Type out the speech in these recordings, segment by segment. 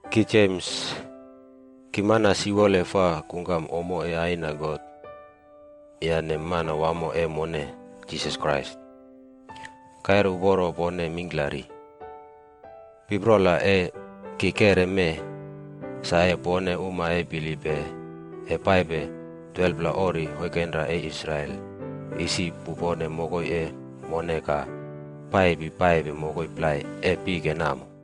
Ki Jems, ki mana siwole fa kungkam ommo e Aina God yane Manawamo e mone, Jisas Krais. Kaire uporo pone mingklari. Piprola e ki keꞌre mee, sa e pone uma e bilippe e paipe 12pla ori oinkenra e Israel isi pupone mokoi e mone ka paipi paipe mokoi plai e pike namo.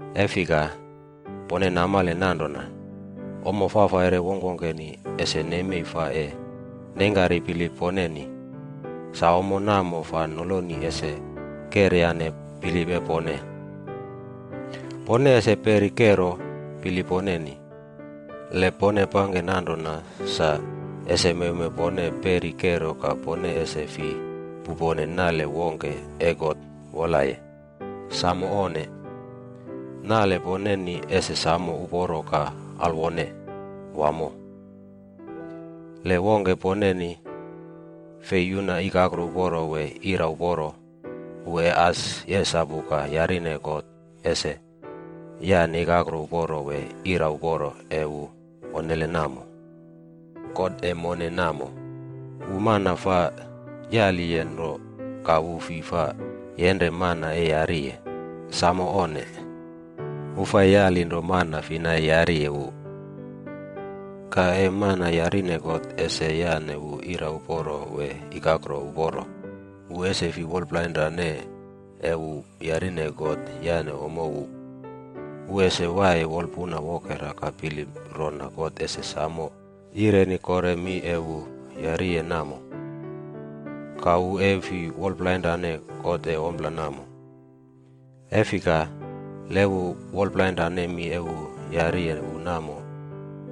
E fika, pone namale nanrona, ommo fafaire wongkwongkeni ese nemei fa e neingkari bilip poneni, sa ommo namo fa noloni ese keryane bilip e pone. Pone ese peri kero bilip poneni. Le pone pangke nanrona sa, ese mewmew pone peri kero ka pone ese fi pupone nale wongke e God wolaye. Samo onne! Nale poneni ese samo uporo ka alwone wamo. Le wongke poneni fei yuna ikakro uporo wee ira uporo, wu e as yesapu ka yarine God ese yane ikakro uporo wee ira uporo e wu onnele namo. God e mone namo, wu mana fa yaliye nro ka wu fi fa yenre mana e yariye. Samo onne! Wu fa yali nro mana fina e yariye wu. Ka e mana yarine God ese yane wu ira uporo wee ikakro uporo, wu ese fi wolpuna plainrane e wu yarine God yane ommo wu. Wu ese waiye wolpun wokera ka bilip rona God ese samo yireni kore mi e wu yariye namo. Ka wu e fi wolplainrane God e ompla namo. E fika, le wu wolplainrane mi e wu yariye wu namo,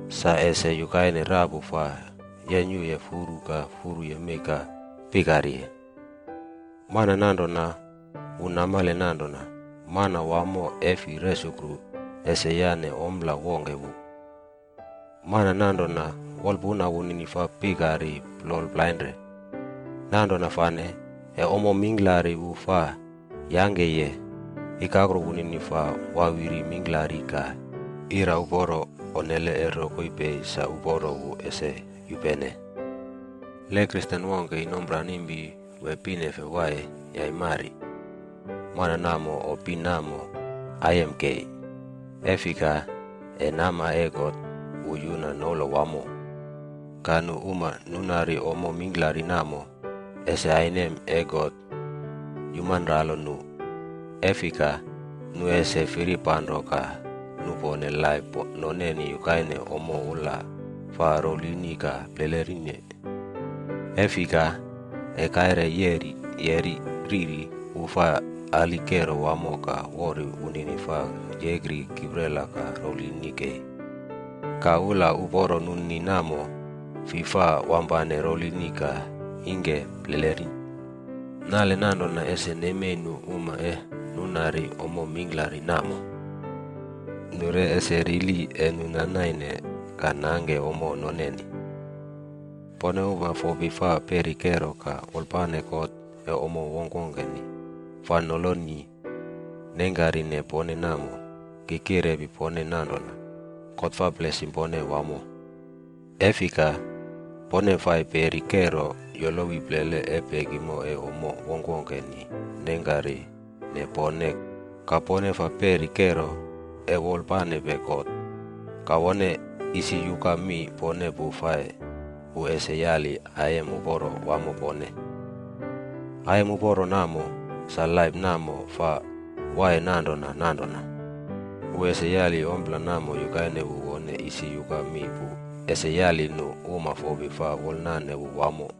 sa ese yukaine rapu fa yenyuye furu ka furu yemei ka pikariye. Mana nanrona, wu namale nanrona Manawamo e fi resukru ese yane ompla wongke wu. Mana nanrona, wolpuna wunini fa pikari plol plainre. Nanrona fane, e ommo mingklari wu fa yangkeye, ikakro wunini fa wawiri mingklari ka ira uporo onnele e rokoi pei sa uporo wu ese yupene. Le Kristen wongke inomranimpi wee pinefe waiye yaimari, mana namo o pin namo aiyem kei, e fika, e nama e God wu yuna noula wamo. Ka nu uma nunari ommo mingklari namo, ese ainem e God yumanralo nu. E fika, nu ese firipanro ka nupone laip noneni yukaine ommo ula fa rouwlini ka plelerine. E fika, e kaire yeri yeꞌri riri, wu fa ali kero wamo ka wori wunini fa yekri kiprela ka rouwlini kei. Ka ula uporo nunini namo, fi fa wampane rouwlinine ka ingke pleleri. Nale nanrona ese nemei nu uma e nunari ommo mingklari namo. Nu re ese rili e nu na naine ka nangke ommo noneni. Pone uma fopi fa peri kero ka wolpane God e ommo wongkwongkeni fa noloni nengkarine pone namo, ki kirepi pone nanrona, God fa blesim pone wamo. E fika, pone fai peri kero yolowi plele e pekimo e ommo wongkwongkeni nengkarine pone ka pone fa peri kero e wolpanepe God, God wone isi yuka mi pone pu fai wu ese yali aiyem uporo wamo pone. Aiyem uporo namo, sa laip namo fa waiye nanrona nanrona. Wu ese yali ompla namo yukaine wu wone isi yuka mi pu ese yali nu uma fopi fa wolnane wu wamo.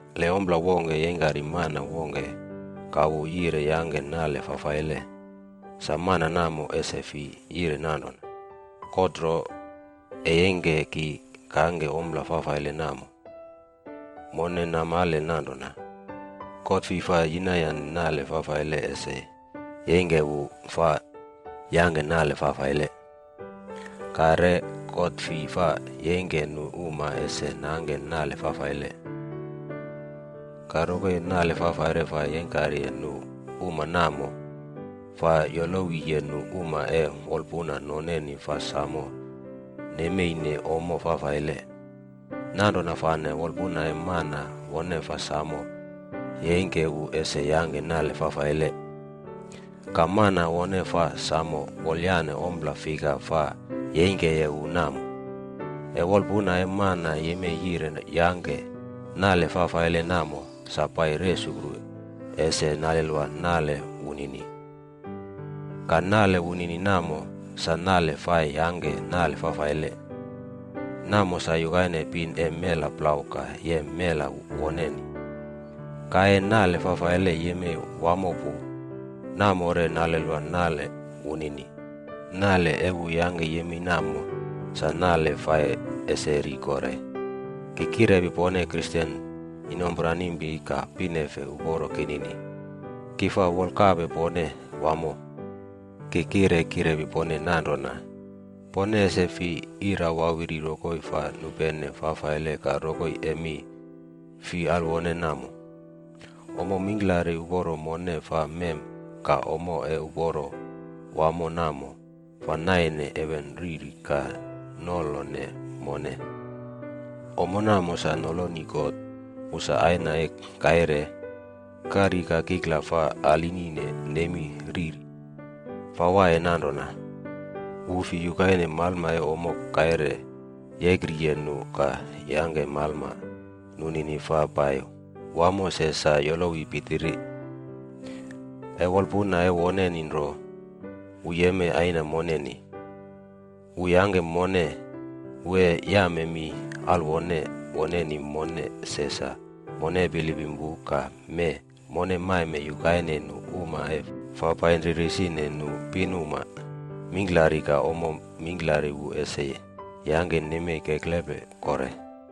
Le ompla wongke yeingkari mana wongke ka wu yire yangke nale fafaile, sa mana namo ese fi yire nanrona, “God nro e yeingke ki kangke ompla fafaile namo.” Mone namale nanrona, God fi fa yinayane nale fafaile ese yeingke wu fa yangke nale fafaile. Ka re, God fi fa yeingke nu uma ese nangke nale fafaile. Ka rokoi e nale fafaire fa yeingkariye nu uma namo, fa yolowiye nu uma e wolpuna noneni fa samo nemeine ommo fafaile. Nanrona fane wolpuna e mana wone fa samo yeingke wu ese yangke nale fafaile. Ka mana wone fa samo wolyane ompla fika fa yeingkeye wu namo. E wolpuna e mana yemei yire yangke nale fafaile namo sa pai resukru ese nalelwa nale wunini. Ka nale wunini namo, sa nale fai yangke nale fafaile. Namo sa yukaine pin e mela plau ka yem mela woneni. Ka e nale fafaile yemei wamo pu, namo re nalelwa nale wunini. Nale e wu yangke yemei namo, sa nale fai ese ri kore. Ki kirepi pone Kristen inomranimpi ka pinefe uporo kinini, ki fa wolkape pone wamo. Ki kire kirepi pone nanrona, pone ese fi ira wawiri rokoi fa nupene fafaile ka rokoi e mi fi alwone namo. Ommo mingklari uporo mone fa mem ka ommo e uporo wamo namo, fa naine heven riri ka nolone mone. Ommo namo sa noloni God wu sa Aina e kaire, kari ka kikla fa aline nemi riri. Fa waiye nanrona. Wu fi yukaine malma e ommo kaire yekriye nu ka yangke malma nunini fa pai wamo se sa yolowi pitiri. E wolpuna e woneni nro, wu yemei Aina moneni. Wu yangke mone, wu e yame mi alwone woneni mone se sa mone bilipim wu ka mee mone maime yukaine nu uma e fa painri risine nu pinuma mingklari ka ommo mingklari wu ese yangke nemei keklepe kore.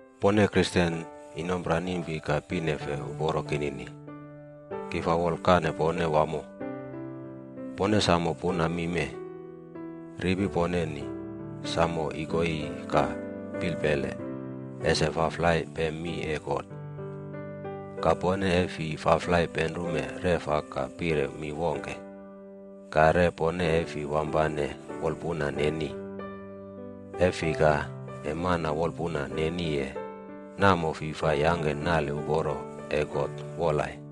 Pone Kristen inomranimpi ka pinefe uporo kinini, ki fa wolkane pone wamo. Pone samo puna mi mee: ripi poneni samo ikoiyi ka pilpele ese faflai pem mi e God. Ka pone e fi faflai penrume reꞌfa ka pire mi wongke. Ka re pone e fi wampane wolpuna neni. E fika, e mana wolpuna neniye, namo fi fa yangke nale uporo e God wolaye.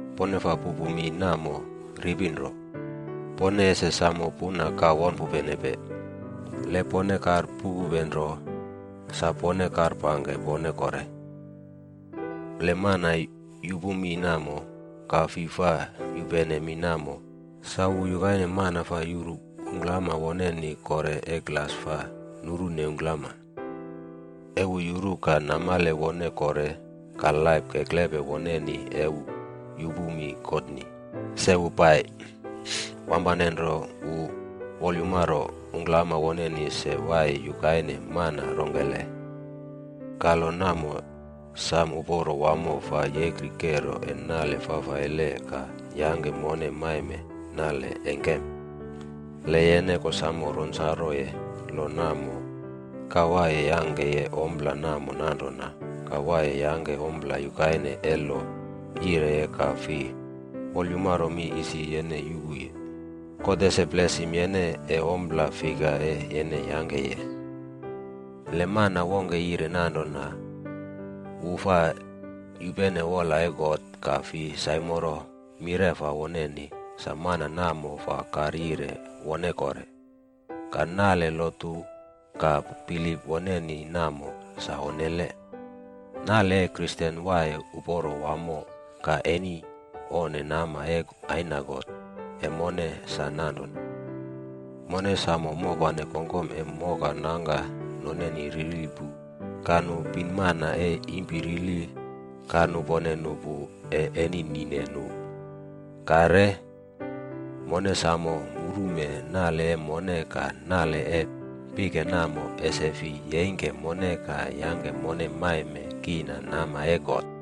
Pone faa pupu mi namo ripi nro, pone ese samo puna ka won pupenepe. Le pone karpupupe nro, sa pone karpangke pone kore. Le e mana yupu mi namo ka fi fa yupene mi namo, sa wu yukaine mana fa yuru ungklama woneni kore e glas fa nurune ungklama. E wu yuru ka namale wone kore ka laip keklepe woneni e wu yupu mi Godni, se wu pai, wampane nro wu wolyumaro ungklama woneni se waiye yukaine man rongkele. Ka lo namo sam uporo wamo fa yekri kero e nale fafaile ka yangke mone maime nale engkem. Le yene kosamo ronsaroye lo namo ka waiye yangkeye ompla namo nanrona ka waiye yangke ompla yukaine e lo yireye ka fi wolyumaro mi isi yene yupuye, God ese blesim yene e ompla fika e yene yangkeye. Le mana wongke yire nanrona wu fa yupene wola e God ka fi saimoro mireꞌfa woneni, sa mana namo fa karyire wonekore. Ka nale lotu ka bilip woneni namo, sa onnele. Nale e Kristen waiye uporo wamo ka eni onne nama e Aina God e mone sa nanrona, mone samo mopane kongkom e moka nangka noneni rili pu ka nu pinmana e impi rili ka nupone nu pu e eni nine nu. Ka re, mone samo murume nale e mone ka nale e pike namo ese fi yeingke mone ka yangke mone maime kiina nama e God.